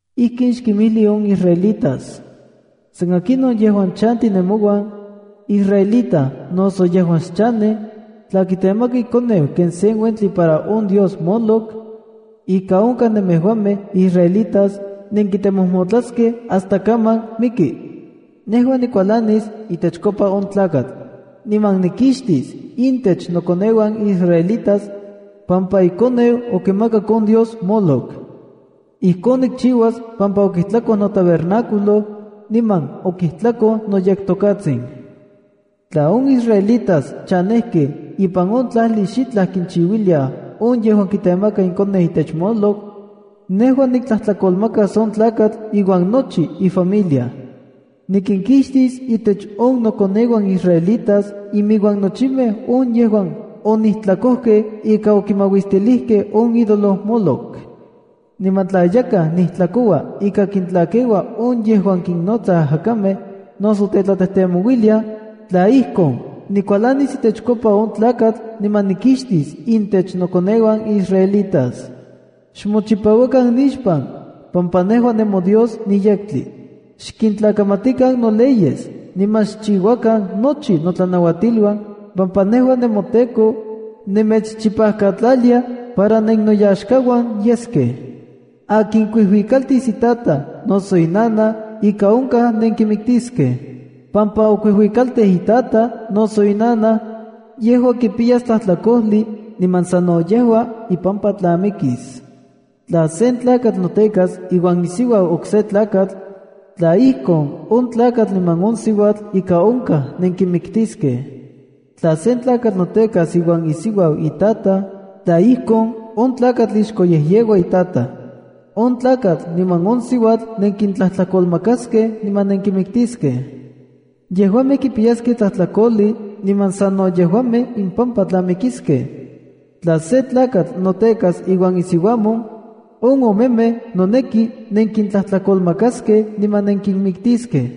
“Ijkin xkinmijli on israelitas: San akinon yejuan chanti nemouan, israelita noso yejuan xchanej, tla kitemaka ikoneu ken sen uentli para on dios Moloc, ika onkaj nemejuamej israelitas nenkitemojmotlaskej hasta kaman miki. Nejua nikualanis itechkopa on tlakatl. Niman nikixtis intech nokoneuan israelitas, pampa ikoneu okimakak on dios Moloc. Ijkon nikchiuas pampa okijtlakoj notabernáculo, niman okijtlakoj noyekTokatsin. Tla on israelitas chanejkej ipan on tlajli xitlaj kichiuiliaj on yejuan kitemaka ikoneu itech Moloc, nejua niktlajtlakolmakas on tlakatl iuan nochi ifamilia. Nikinkixtis intech on nokoneuan israelitas imiuan nochimej on yejuan onijtlakojkej ika okimauistilijkej on idolo Moloc. ’Niman tla yakaj nijtlakoua ika kintlakeua on yejuan kinnotsaj ajakamej noso tetlatejtemouiliaj, tla ijkon, nikualanis itechkopa on tlakatl, niman nikixtis intech nokoneuan israelitas. Xmochipauakan nixpan, pampa nejua nemoDios niyektli. Xkintlakamatikan no leyes niman xchiuakan nochi notlanauatiluan, pampa nejua, nemoTEKO, nemechchipajkatlalia para nennoyaxkauan yeskej. ’Akin kuijuikaltis itajtaj noso inanaj, ika onkaj nenkimiktiskej. Pampa okuijuikaltij itajtaj noso inanaj, yejua kipiyas tlajtlakojli niman sano yejua ipampa tla mikis. ’Tla sen tlakatl notekas iuan isiuau okse tlakatl, tla ijkon, on tlakatl niman on siuatl ika onkaj nenkinmiktiskej. ’Tla sen tlakatl notekas iuan isiuau itataj, tla ijkon, on tlakatl ixkoyejyeua itataj. On tlakatl niman on siuatl, nenkintlajtlakolmakaskej niman nenkinmiktiskej. Yejuamej kipiyaskej tlajtlakojli niman sano yejuamej impampa tla mikiskej. ’Tla se tlakatl notekas iuan isiuamon, on omemej noneki nenkintlajtlakolmakaskej niman nenkinmiktiskej.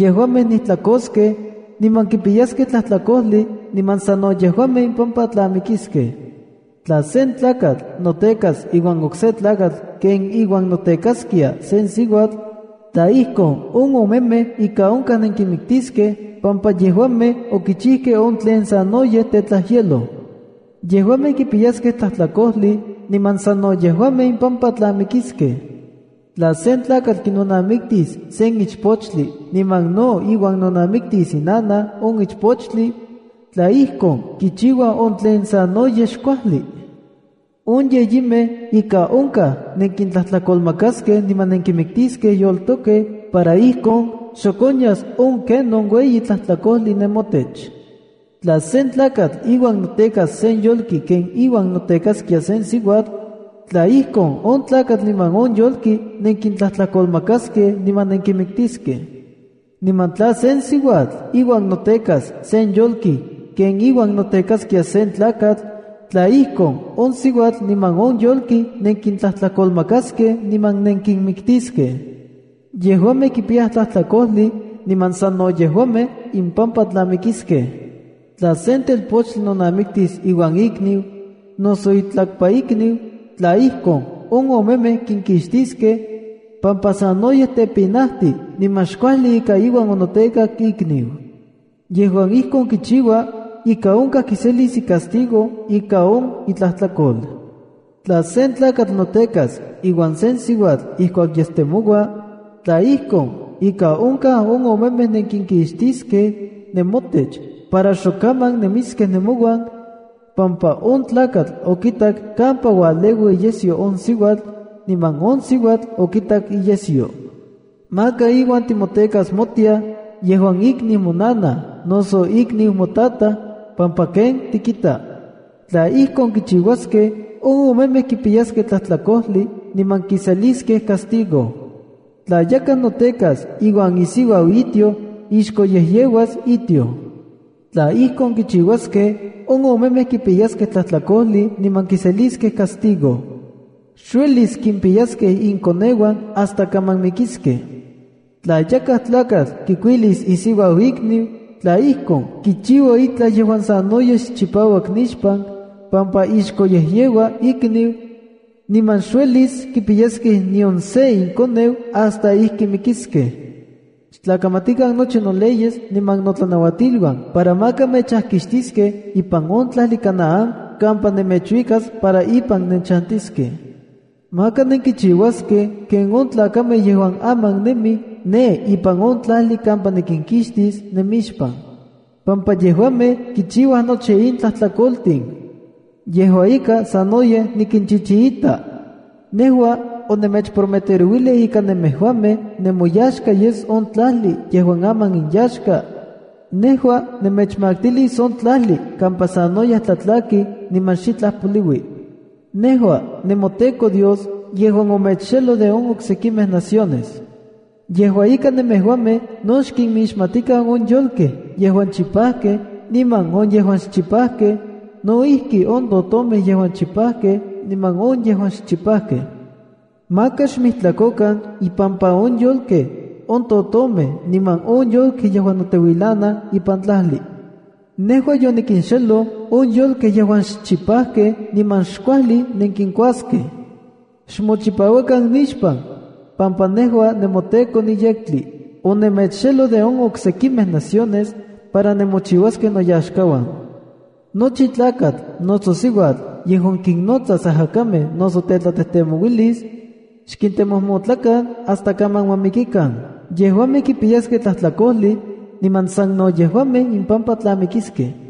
Yejuamej nijtlakoskej, niman kipiyaskej tlajtlakojli niman sano yejuamej impampa tla mikiskej. ’Tla sen tlakatl notekas iuan okse tlakatl ken iuan notekaskia sen siuatl, tla ijkon, on omemej ika onkaj nenkinmiktiskej pampa yejuamej okichijkej on tlen sanoyej tetlajyeloj. Yejuamej kipiyaskej tlajtlakojli niman sano yejuamej impampa tla mikiskej. ’Tla sen tlakatl kinonamiktis sen ichpochtli niman no iuan nonamitis inanaj on ichpochtli, tla ijkon, kichiuaj on tlen sanoyej xkuajli. On yeyimej ika onkaj nenkintlajtlakolmakaskej niman nenkintlatiskej yoltokej para ijkon xok onyas on kenon ueyi tlajtlakojli nemotech. ’Tla sen tlakatl iuan notekas sen yolki ken iuan notekaskia sen siuatl, tla ijkon, on tlakatl niman on yolki nenkintlajtlakolmakaskej niman nenkinmiktiskej. ’Niman tla sen siuatl iuan notekas sen yolki ken iuan notekaskia sen tlakatl, tla ijkon, on siuatl niman on yolki nenkintlajtlakolmakaskej niman nenkinmiktiskej. Yejuamej kipiyaj tlajtlakojli, niman sano yejuamej impampa tla mikiskej. ’Tla sen telpochtli nonamiktis iuan ikniu, noso itlakpaikniu, tla ijkon, on omemej kinkixtiskej, pampa sanoyej tepinajtij niman xkuajli ika iuan onotekak ikniu. Yejuan ijkon kichiua, ika onkaj kiselis icastigo ika on itlajtlakol. ’Tla sen tlakatl notekas iuan sen siuatl ijkuak yestemoua, tla ijkon, ika onkaj on omemej nenkinkixtiskej nemotech para xokaman nemiskej nemouan, pampa on tlakatl okitak kampa ualeua iyesyo on siuatl, niman on siuatl okitak iyesyo. ’Maka iuan timotekas motiaj, yejuan ikniu monanaj noso ikniu motataj, pampa ken tikita. Tla ijkon kichiuaskej, on omemej kipiyaskej tlajtlakojli niman kiseliskej castigo. ’Tla yakaj notekas iuan isiuau itioj, ixkoyejyeuas itioj. Tla ijkon kichiuaskej, on omemej kipiyaskej tlajtlakojli niman kiseliskej castigo. Xuelis kimpiyaskej inkoneuan hasta kaman mikiskej. ’Tla yakaj tlakatl kikuilis isiuau ikniu, tla ijkon, kichiua itlaj yejuan sanoyej xchipauak nixpan, pampa ixkoyejyeua ikniu, niman xuelis kipiyaskej nion se inkoneu hasta ijki mikiskej. ’Xtlakamatikan nochi noleyes niman notlanautiluan para maka mechajkixtiskej ipan on tlajli Canaán kampa nemechuikas para ipan nenchantiskej. Maka nenkichiuaskej ken on tlakamej yejuan aman nemij ne ipan on tlajli kampa nikinkixtis nemixpan, pampa yejuamej kichiuaj nochi in tlajtlakoltin. Yejua ika, sanoyej nikinchichiita. Nejua onemechprometerouilij ika nemejuamej nemoyaxka yes on tlajli yejuan aman inyaxka. Nejua nemechmaktilis on tlajli kampa sanoyej tlatlaki niman xitlaj poliui. ’Nejua nemoTEKO Dios yejuan omechxeloj de on oksekimej naciones. Yejua ika, nemejuamej no xkinmixmatikan on yolkej yejuan chipajkej niman on yejuan xchipajkej, no ijki on totomej yejuan chipajkej niman on yejuan xchipajkej. Maka xmijtlakokan impampa on yolkej, on totomej, niman on yolkej yejuan noteuilanaj ipan tlajli. Nejua yonikinxeloj on yolkej yejuan xchipajkej niman xkuajli nenkinkuaskej. Xmochipauakan nixpan, pampa nejua nemoTEKO niyektli. Onemechxeloj de on oksekimej naciones para nemochiuaskej noyaxkauan. ’Nochi tlakatl noso siuatl yejuan kinnotsas ajacamej noso tetlatejtemouilis, xkintemojmotlakan hasta kaman ma mikikan. Yejuamej kipiyaskej tlajtlakojli niman sano yejuamej impampa tla mikiskej.”